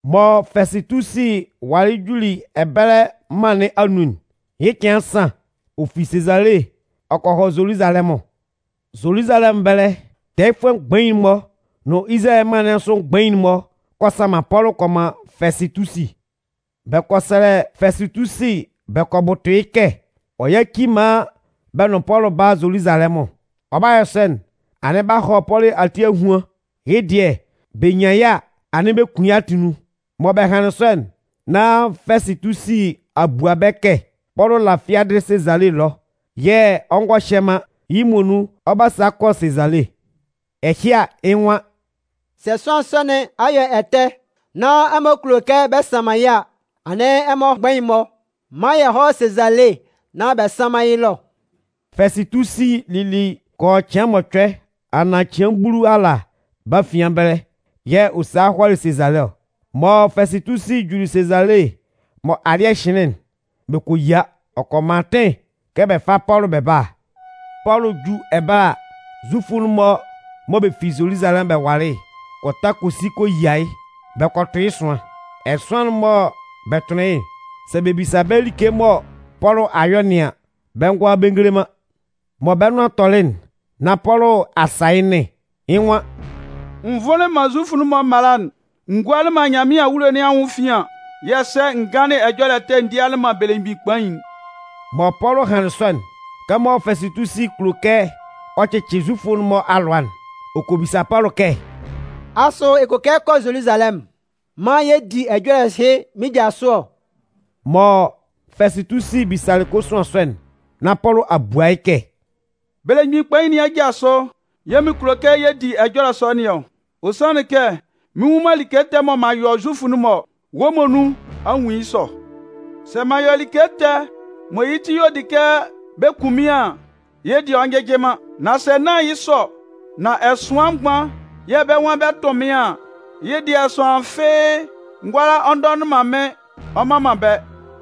Mɔ Fɛsɩtusi walɩ juli ɛbɛlɛ mân nɩn anun'n, yɩ́ cɩan nsan, ɔ fi Sezale ɔ kɔ hɔ Zoluzalɛmʋn. Zoluzalɛmʋn ɛbɛlɛ tɛɛyɩfʋɛ mgbain'n-mɔ nʋn Izalayɛ mân nɩn asʋ mgbain'n-mɔ kɔ sanman Pɔlʋ kɔ man Fɛsɩtusi. Bɛ kɔ sɛlɛ Fɛsɩtusi bɛ kɔ bʋtʋ yɩ́ kɛ ɔ yáci maan bɛ nʋn Pɔlʋ bála Zoluzalɛmʋn. Ɔ 'ba yɔ sɔ'n, anɩn b'a hɔ Pɔlʋ ati ahuan, yɩ́ dɩɛ bɛ nyan yɩ́ a, anɩn bɛ kun yɩ́ atunnun. Mɔ bɛ hanlɩn sɔ'n, nan Fɛsɩtusi a bua bɛ́ kɛ Pɔlʋ la fiadɩ Sezale ɛlɔ yɛ̂ ɔ ngɔ hyɛ man, yɩ́ muonun ɔ 'ba sa kɔ Sezale. Ɛhɩ a, yɩ́ nwan: “Sɛ sʋanlan sɔ nɩn a yɔ ɛtɛ nán ɛmɔ kulo kɛ bɛ sanman yɩ́ a, anɩn ɛmɔ mgbain'n-mɔ mán yɛ hɔ́ Sezale nán bɛ sánman yɩ́ ɛlɔ.” Fɛsɩtusi lili kɔ yɔ cɩan mɔcʋɛ anaan cɩan bulu ala bɛ́ afian ɛbɛlɛ yɛ̂ ɔ salɩ hɔlɩ Sezale ɔ. Mɔ Fɛsɩtusi juli Sezale mɔ alɩ́ɛ hɩnlɩn'n, bɛ kɔ yia. Ɔ kɔ man atɩn kɛ bɛ fá Pɔlʋ bɛ bála. Pɔlʋ 'ju ɛbɛlɛ ala, Zufʋ'n-mɔ mɔ bɛ fi Zoluzalɛmʋn bɛ walɩ'n kɔ ta kɔ si kɔ yia yɩ́ bɛ kɔ tʋn yɩ́ ɛsʋan. Ɛsʋan'n mɔ bɛ tʋnlɩn yɩ́'n, sɛ bɛ bisa bɛ́ like mɔ Pɔlʋ a yɔ nɩn an, bɛ ngʋala bɛ ngele man. Mɔ bɛ́ nʋan tɔlɩ'n nán Pɔlʋ a sa yɩ́ nɩn. Yɩ́ nwan: “N vʋnlɩn man Zufʋ'n-mɔ mala'n, n gualɩ man Nyanmɩan awulo nɩn anwʋn efian yɛ̂ ɛsɛ n ganlɩn ɛjɔlɛ ɛtɛ n dialɩ man belemgbin kpain'n.” Mɔ Pɔlʋ hanlɩn sɔ'n, kɛmɔ Fɛsɩtusi kulo kɛ ɔ cɩcɩ Zufʋ'n-mɔ alʋa'n, ɔ kɔ bisa Pɔlʋ kɛ: “Asʋ ɛ kulo kɛ ɛ kɔ Zoluzalɛmʋn maan yɛ di ɛjɔlɛ ɛhɩ mɩ́n ja sʋ ɔ?” Mɔ Fɛsɩtusi bisalɩ kosuan sɔ'n nán Pɔlʋ a bua yɩ́ kɛ: “Belemgbin kpain nɩn aja sʋ yɛ̂ mɩn kulo kɛ yɛ di ɛjɔlɛ sɔ nɩn ɔ. Ɔ sanlɩn kɛ mɩn nwun man like ɛtɛ mɔ m'an yɔ Zufʋ'n-mɔ ɔ, wɔ́ muonun a nwun yɩ́ sɔ. Sɛ m'an yɔ like ɛtɛ mɔ yɩ́ ti y'ɔ di kɛ bɛ kun mɩ́n an, yɩ́ dɩɛ ɔ njɩjɩ man. Nan sɛ nán yɩ́ sɔ nán ɛsʋan mgban yɛ̂ bɛ́ nwan bɛ 'tʋn mɩ́n an, yɩ́ dɩɛ sʋanlan fɩ́ɩ́ ngʋala ɔ ndɔnɩn man mɩ́n ɔ mman man bɛ́.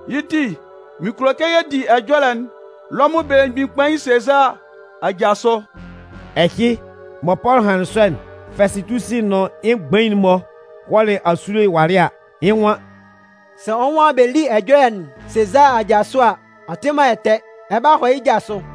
Yɩ́ ti, mɩn kulo kɛ yɛ di ɛjɔlɛ'n Lɔmʋn belemgbin kpain Sezaa aja sʋ.” Ɛhɩ, mɔ Pɔlʋ hanlɩn sɔ'n, Fɛsɩtusi nʋn yɩ́ mgbain'n-mɔ hɔlɩ asule walɩ a, yɩ́ nwan: “Sɛ wɔ́ nwan bɛ́ lí ɛjɔlɛ'n Sezaa aja sʋ a, ɔ tɩ man ɛtɛ. Ɛ 'ba hɔ yɩ́ ja sʋ.”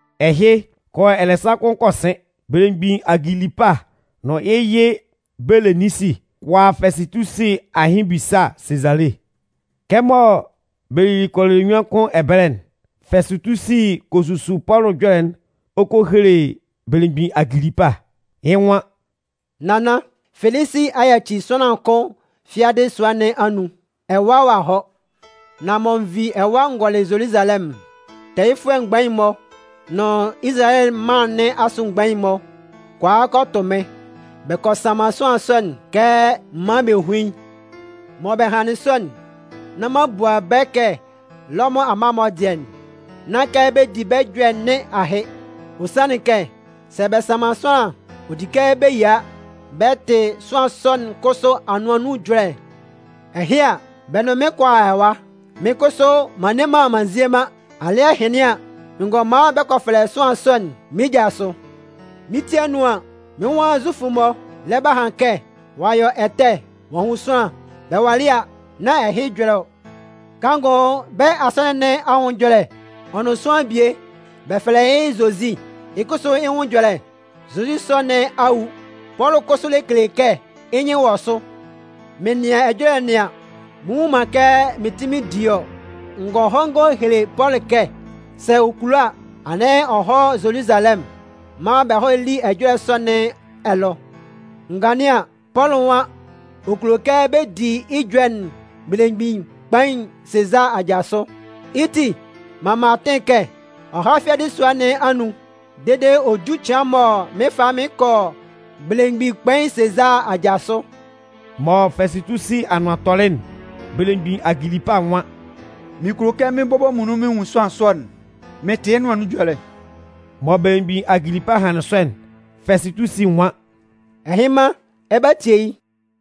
Ɛhɩ, kɔ yɔ ɛlɛsan kʋn kɔ sɩn, belemgbin Agilipa nʋn yɩ́ yɩ Beleninsi kɔ a Fɛsɩtusi ahɩn ebisa Sezale. Kɛmɔ bɛ lili kɔ yɔ ɛlɛnyuan kʋn ɛbɛlɛ'n, Fɛsɩtusi kɔ susu Pɔlʋ ɛjɔlɛ'n ɔ kɔ hele belemgbin Agilipa. Yɩ́ nwan: “Nannan, Felisi a yaci sʋanlan kʋn fiadɩ sua nɩn anun ɛwa ɔ a hɔ. Nan mɔ n vi ɛwa n gɔlɩ Zoluzalɛmʋn'n, tɛɛyɩfʋɛ mgbain'n-mɔ nʋn Izalayɛ mân nɩn asʋ mgbain'n-mɔ kɔ a kɔ tʋ mɩ́n, bɛ kɔ sanman sʋanlan sɔ'n kɛ m mán bɛ hún yɩ́. “Mɔ bɛ hanlɩn sɔ'n, nán m'an bua bɛ́ kɛ Lɔmʋn amma'n-mɔ dɩɛ, nán kɛ bɛ di bɛ́ ɛjɔlɛ nɩn ahɩ. Ɔ sanlɩn kɛ, sɛ bɛ sanman sʋanlan an, ɔ di kɛ bɛ yia bɛ tɩ sʋanlan sɔ'n kʋsʋ anʋan nun ɛjɔlɛ. Ɛhɩ a, bɛ nʋn mɩ́n kɔ a ɛwa. Mɩ́n kʋsʋ m'an nne m'an nzie man, alɩ́ɛ hɩnlɩn an, n gɔ man bɛ kɔ fɛlɛ sʋanlan sɔ'n mɩ́n ja sʋ. Mɩ́n ti anun an, mɩ́n nwan Zufʋ'n-mɔ lɛ ba han kɛ ɔ'a yɔ nyɔlɩɛ ɛtɛ ɔ'a hun sʋanlan. Bɛ walɩ a, nán ɛhɩ ɛjɔlɛ ɔ. Kanngʋ bɛ́ asɔnɩn nɩn anwʋn ɛjɔlɛ ɔ nʋn sʋanlan bie, bɛ fɛlɛ yɩ́ Zozi, yɩ́ kʋsʋ yɩ́ nwʋn ɛjɔlɛ. Zozi sɔ nɩn a wu, Pɔlʋ kʋsʋ lɛ kele kɛ yɩ́ nyɩn wɔ sʋ. Mɩn nɩan ɛjɔlɛ nɩn an, mɩn nnwun man kɛ mɩn kpɩn mɩn di yɩ́ ɔ. N gɔ han n gɔ hele Pɔlʋ kɛ sɛ ɔ kulo a, anɩn ɔ hɔ́ Zoluzalɛmʋn maan bɛ hɔ́ lí ɛjɔlɛ sɔ nɩn ɛlɔ. N ganlɩn an, Pɔlʋ nwan ɔ kulo kɛ bɛ di yɩ́ ɛjɔlɛ'n belemgbin kpain Sezaa aja sʋ. Yɩ́ ti, m'an man atɩn kɛ ɔ há fiadɩ sua nɩn anun dede ɔ jú cɩan mɔ mɩn 'fa yɩ́ mɩn kɔ belemgbin kpain Sezaa aja sʋ.” Mɔ Fɛsɩtusi anʋan tɔlɩ'n, belemgbin Agilipa nwan: “Mɩn kulo kɛ mɩ́n bɔbɔ muonun mɩn nwun sʋanlan sɔ'n mɩn tɩ yɩ́ nʋan nun ɛjɔlɛ.” Mɔ belemgbin Agilipa hanlɩn sɔ'n, Fɛsɩtusi nwan: “Ɛhɩnman, ɛ 'ba tie yɩ́.”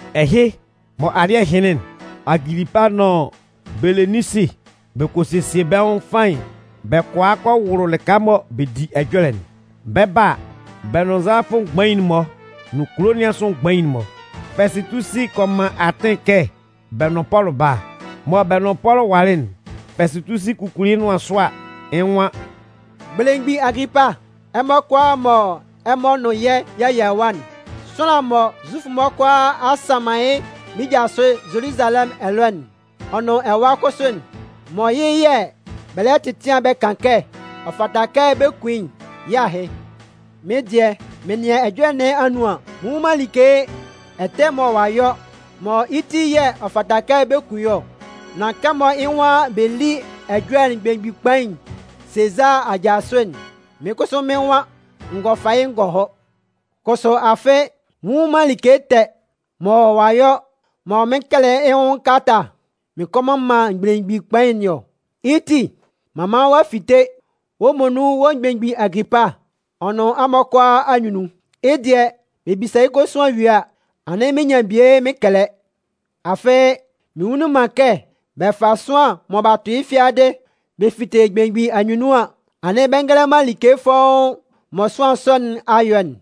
Ɛhɩ, mɔ alɩ́ɛ hɩnlɩn'n, Agilipa nʋn Beleninsi bɛ kɔ sesie bɛ́ nwʋn faɩn bɛ kɔ a kɔ wʋlʋ lɩka mɔ bɛ di ɛjɔlɛ'n. Bɛ 'ba a, bɛ nʋn nzalafʋ mgbain'n-mɔ nʋn kulo nɩn asʋ mgbain'n-mɔ. Fɛsɩtusi kɔ man atɩn kɛ bɛ nʋn Pɔlʋ bála. Mɔ bɛ nʋn Pɔlʋ walɩ'n, Fɛsɩtusi kukuli yɩ́ nʋan sʋ a, yɩ́ nwan: “Belemgbin Agilipa, ɛmɔ kʋalaa mɔ ɛmɔ nʋn yɛ́ y'a yia ɛwa'n, sʋanlan'n mɔ Zufʋ'n-mɔ kʋalaa a a sanman yɩ́ mɩ́n ja sʋ Zoluzalɛmʋn ɛlɔ ɔ nʋn ɛwa kʋsʋ'n, mɔ yɩ́ yɛ̂ bɛ lɛ tɛtɩan bɛ kan kɛ ɔ fata kɛ bɛ kun yɩ́'n, yɩ́ ahɩ. Mɩ́n dɩɛ, m'an nɩan ɛjɔlɛ nɩn anun an, mɩn nnwun man like ɛtɛ mɔ ɔ'a yɔ mɔ yɩ́ ti yɛ̂ ɔ fata kɛ bɛ kun yɩ́ ɔ. Nan kɛmɔ yɩ́ nwan bɛ lí ɛjɔlɛ'n belemgbin kpain Sezaa aja sʋ'n, mɩ́n kʋsʋ mɩ́n nwan n gɔ fa yɩ́ n gɔ hɔ. Kʋsʋ afɩ, mɩn nnwun man like ɛtɛ mɔ ɔ'a yɔ mɔ mɩn kɛlɛ yɩ́ nwʋn kalata mɩn kɔ man belemgbin kpain nɩn ɔ. Yɩ́ ti, m'an man ɔ'a fite wɔ́ muonun wɔ́ belemgbin Agilipa ɔ nʋn ɛmɔ kʋalaa anyunnun. Yɩ́ dɩɛ, bɛ bisa yɩ́ kosuan yue a, anɩn mɩn nyan bie mɩn kɛlɛ. Afɩ, mɩn nnwunlin man kɛ bɛ 'fa sʋanlan mɔ b'a tʋ yɩ́ fiadɩ bɛ fite belemgbin anyunnun an, anɩn bɛ ngele man like fɔ́ʋ́n'n mɔ sʋanlan sɔ nɩn a yɔ'n.”